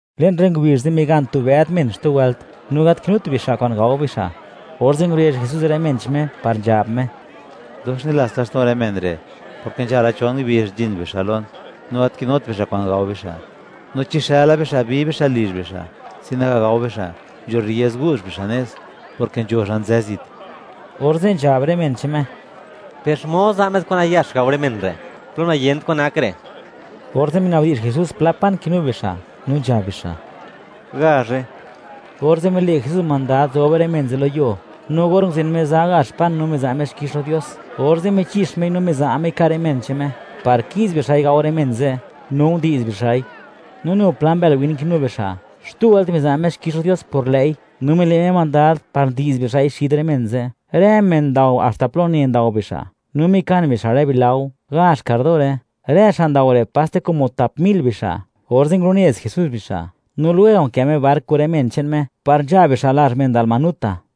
Le'n rë ngubizh ze', migan tu bëd men xtu wëlt, no gat kinut bixa' kwa'n gao bixa'; orze' ngurezh Jesús rë men che'n Me par nzhab Me: ―Dox nilats laxto'n rë men re', porke nzhala chon ngubizh nzhin bixa' lon, no gat kinut bixa' kwa'n gao bixa', no chi xëla bixa', bi bixa' lizh xa', sin naga gao bixa', nzho rriez gu'zh bixa' nez, porke nzho xa' nzë zit. Orze' nzhab rë men che'n Me: ―Per, ¿xmod za' met kwa'n nayax gao rë men re', plo niyent kwan nak re'? Orze' minabdi'zh Jesús pla pan kinu bixa', no nzhab bixa': ―Gazhe. Orze' mile' Jesús mandad, zob rë men ze' lo yuo, no or nguzen Me za gazh pan, no miza' Me xkix lo Dios, orze' michix Mei no miza' Mei ka' rë men che'n Me par ki'z bixa'i gao rë men ze', no ndi'z bixa'i. No nu pla mbël win kinu bixa'; xtu wëlt miza' Me xkix lo Dios por lë'i, no mile' Me mandad, par ndi'z bixa'i xid rë men ze'. Rë men ndao haxta plo une ndao bixa', no mikan bixa' rë bilao; gazh kardore. Rë xa' ndao re', paste como tap mil bixa'. Orze' ngulunez Jesús bixa'. No lwega' nkë Me bark kun rë men che'n Me, par nzha bixa' lazh men Dalmanuta.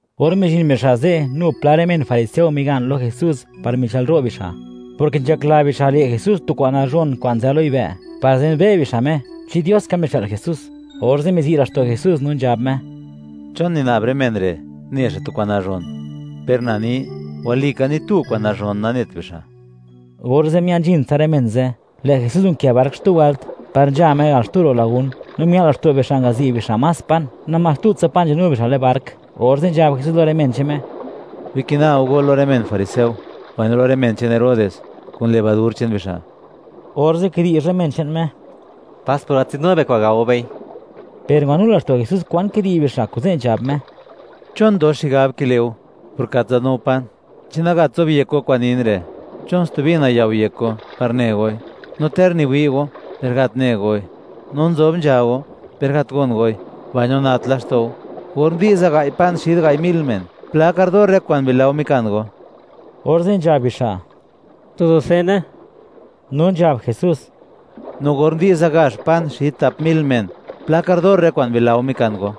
Or mizhin bixa' ze', nu pla rë men fariseo migan lo Jesús, par michë'lro' bixa', porke nzhakla bixa', le' Jesús tu kwa'n nazhon kwa'n nzë lo yibë', par zenbe' bixa' Me (wi' bixa' xmod nak Me), chi Dios ka mixë'l Jesús. Orze' mizi' laxto' Jesús, no nzhab Me: ―¿Chon nina'b rë men re', ne xa' tu kwa'n nazhon? Per na ni, walika ni tu kwa'n nazhon nanet bixa'. Orze' mia'n nzhin tsa rë men ze', lë' Jesús nkë bark xtu wëlt, par nzha Me al xtu ro' lagún. No mia'l laxto' bixa' ngazi' bixa' más pan, namás tutsa pan nzadnu bixa' le'n bark. Orze' nzhab Jesús lo rë men che'n Me: ―Bikina go go lo rë men fariseo, mbaino lo rë men che'n Herodes, kun levadur che'n bixa'. Orze' kidi'zh rë men che'n Me: ―Pas, por gat nzadnu be pan, gao bei. Per ngwanu laxto' Jesús kwan kidi'zh bixa', kuze' nzhab Me: ―¿Chon dox xigab kile' go, por gat nzadnu go pan? ¿Chi nagat zobyek go kwa'n nin re'? ¿Chon stubi nayao' yek go, par ne goi? ¡No ter niwi' go, per gat ne goi; no nzob nzha go, per gat gon goi; mbaino nat laxto' go! Or ndi'za gai' pan xid gai' mil men, ¿pla kardor rë kwa'n bilao mikan go? Orze' nzhab bixa': ―Tu dusene. No nzhab Jesús: ―¿No or ndi'za gazh pan xid tap mil men, pla kardor rë kwa'n bilao mikan go?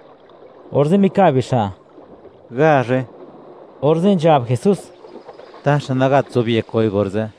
Orze' mikab bixa': ―Gazhe. Orze' nzhab Jesús: ―¿Taxa nagat zobyek goi orze'?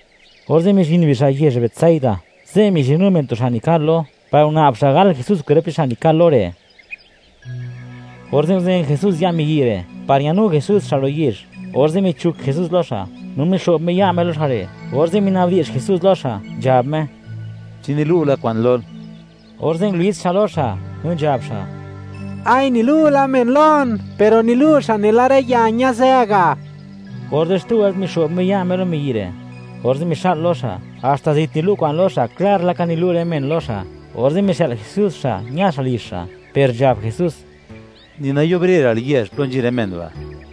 Orze' mizhin bixa' yezh Betsaida, ze' mizhinnu men tu xa' nikal lo, par nguna'b xa' gal Jesús kwerp che'n xa' nikal lo re'. Orze' nguzen Jesús ya' miyi' re', par ñanu Jesús xa' ro' yezh; orze' michuk Jesús lo xa', no mixo'b Me ya' Me lo xa' re', orze' minabdi'zh Jesús lo xa', nzhab Me: —¿Chi nilu' la kwa'n lol? Orze' ngulits xa' lo xa', no nzhab xa': —Nilu' la men lon, per nilu' bixa' nela rë ya ñazë ga'. Orze' xtu wëlt mixo'b Me ya' Me lo miyi' re', orze' mixa'l lo xa', haxta zit nilu' kwa'n lo xa', klar laka nilu' rë men lo xa'. Orze' mixë'l Jesús xa', ña xa' lizh xa', per nzhab Jesús: ―Ni nayubrera'l yezh plo nzhin rë men ba'.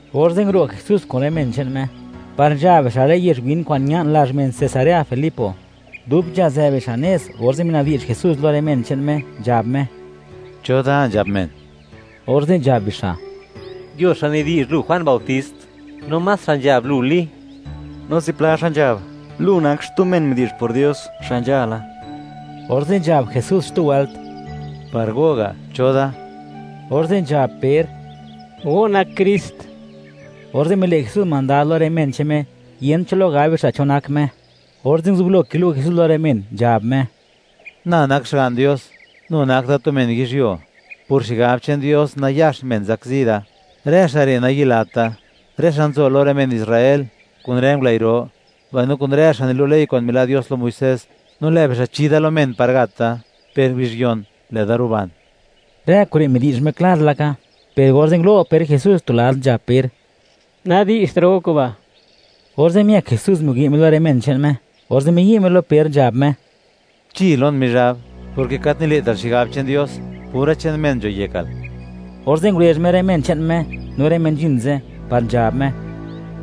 Orze' nguro' Jesús kun rë men che'n Me, par nzha bixa' rë yezh win kwa'n ña'n lazh men Cesarea Filipo. Dub nzhazë bixa' nez, orze' minabdi'zh Jesús lo rë men che'n Me, nzhab Me: ―¿Cho da, nzhab men? Orze' nzhab bixa': ―Nzho xa' nidi'zh, Lu Juan bautist; no más xa' nzhab, Lu Li; no zipla xa' nzhab, Lu nak xtu men midi'zh por Dios, xa' nzhala. Orze' nzhab Jesús xtu wëlt: ―Par go ga'; ¿cho da? Orze' nzhab Per: ―Go nak Krist. Orze' mile' Jesús mandad lo rë men che'n Me, yent cho lo gab bixa' cho nak Me. Orze' nguzublo kilu' Jesús lo rë men che'n Me, nzhab Me: ―Na nak Xga'n Dios, no nu nak da tu men yizhyuo; por xigab che'n Dios, nayax men zakzi da. Rë xa' re' nayilat da: Rë xa' nzo lo rë men Israel, kun rë ngulëi' ro, mbaino kun rë xa' nilu' ley kwa'n mila' Dios lo Muisés. No lë' bixa' chi da lo men par gat da. Per ngubizh yon, lë'da ruban. Rë kure' midi'zh Me klar laka, per orze' ngulo' Per Jesús tu lad, nzhab Per: ―¡Nadi'zhtra' go kuba'! Orze' miëk Jesús, niwi' Me lo rë men che'n Me, orze' miyi' Me lo Per, nzhab Me: ―¡Chi lon, Mizhab!, porke gat nile'tal xigab che'n Dios; pura che'n men nzho yekal. Orze' ngurezh Me rë men che'n Me, no rë men nzhin ze', par nzhab Me: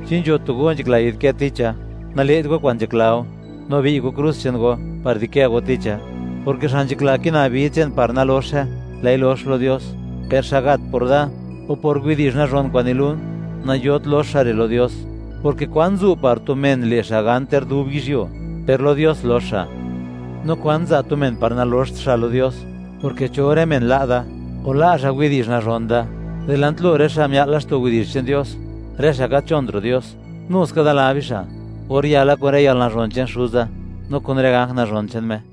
―Chi nzho tu go nzhakla yi'dkë ticha, nale't go kwa'n nzhakla go, no bi'y go krus che'n go par di'kë go ticha, porke xa' nzhakla kina vid che'n par naloxe, lë'i lox lo Dios; per xa' gat por da o por widi'zh nazhon kwa'n nilun, nayot lox xa' re' lo Dios, porke, ¿kwan zu' par tu men, le' xa' gan ter dub yizhyuo, per lo Dios lox xa'? No, ¿kwan za' tu men par naloxt xa' lo Dios?, porke cho rë men la' da, o la' xa' widi'zh nazhon da, dilant lo rë xa' mia'l laxto' widi'zh che'n Dios, rë xa' gat nzhont ro' Dios; nu ska da la bixa', or yala, kun rë yalnazhon che'n Xuza, no kun rë ganj nazhon che'n Me.